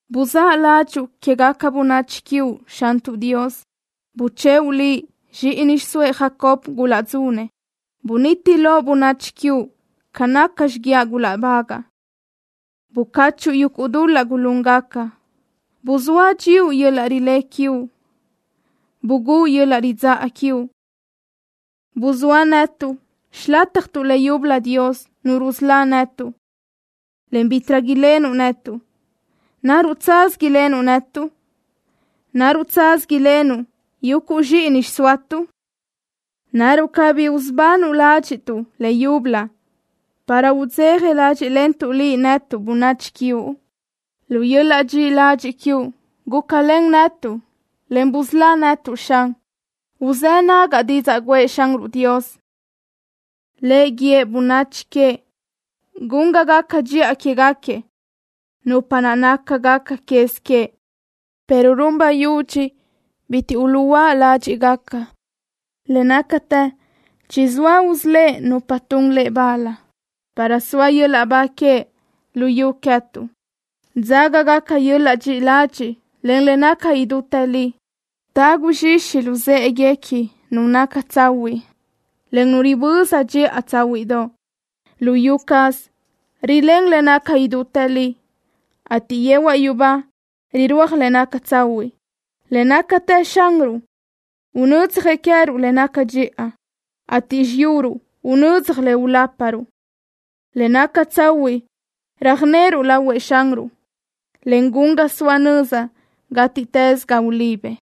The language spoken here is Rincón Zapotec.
Buzáʼ ládxuʼu quégaca bönachi quiuʼ, Xantuʼ Dios. Buchëʼu Liʼ zxíʼini xiʼsóëʼ Jacob gulaʼdzunëʼ. Buniti loʼ bönachi quiuʼ ca naca xiguiaʼ gulaʼbagaʼ. Bucáchuʼu yuguʼ dul-laʼ gulúngaca. Buzóa dxíuʼ yöl-laʼ rilé quiuʼ. Bugúʼ yöl-laʼ ridzáʼa quiuʼ. Buzóa netuʼ xilátjatuʼ le yúbölö, Dios, Nu rusölá netuʼ, en bítiʼrö lenuʼ netuʼ. ¿Naruʼ tsaz ilenuʼ netuʼ? ¿Naruʼ tsaz ilenuʼ yuguʼ zxíʼini xsoatuʼ? ¿Naruʼ cabí usubanuʼ ládxiʼtuʼ le yúbölö, para udzeja ládxiʼlentuʼ Liʼ netuʼ, bönachi quiuʼ? Lu yöl-laʼ dxiʼi ladxiʼ quiuʼ gúcalen netuʼ, en busölá netuʼ, Xan. Uzë́ nagaʼ didzaʼ guʼë Xanruʼ Dios. Le guíëʼ bönachi queëʼ gun ga gaca dxiʼa quéguequi, nupa naʼ nácagaca quez queëʼ, pero run bayúdx bitiʼ uluʼhuö́a ládxiʼgaca. Le nácatë chizóëʼ usölë́ʼ nupa tun Lëʼ bal, para soa yöl-laʼ ba queëʼ luyú queë́tuʼ. Dzágagaca yöl-laʼ dxiʼi ladxiʼ, en le naca idútë li. Tagu zxixi luzë́ʼeguequi nu naca tsahuiʼ, en nu riböza dxiʼa tsáhuiʼdoʼ. Luyú caz rilén le naca idútë li, ateʼ yehuaʼ yubá rirúaj le naca tsahuiʼ. Le nácatë Xanruʼ unödzjëʼ queë́ruʼ le naca dxiʼa, ateʼ xiyuruʼ unödzaj le uláparuʼ. Le naca tsahuiʼ röjnöru lahuëʼ Xanruʼ, en gun ga soa nöza gátiʼtës ga ulibëʼ.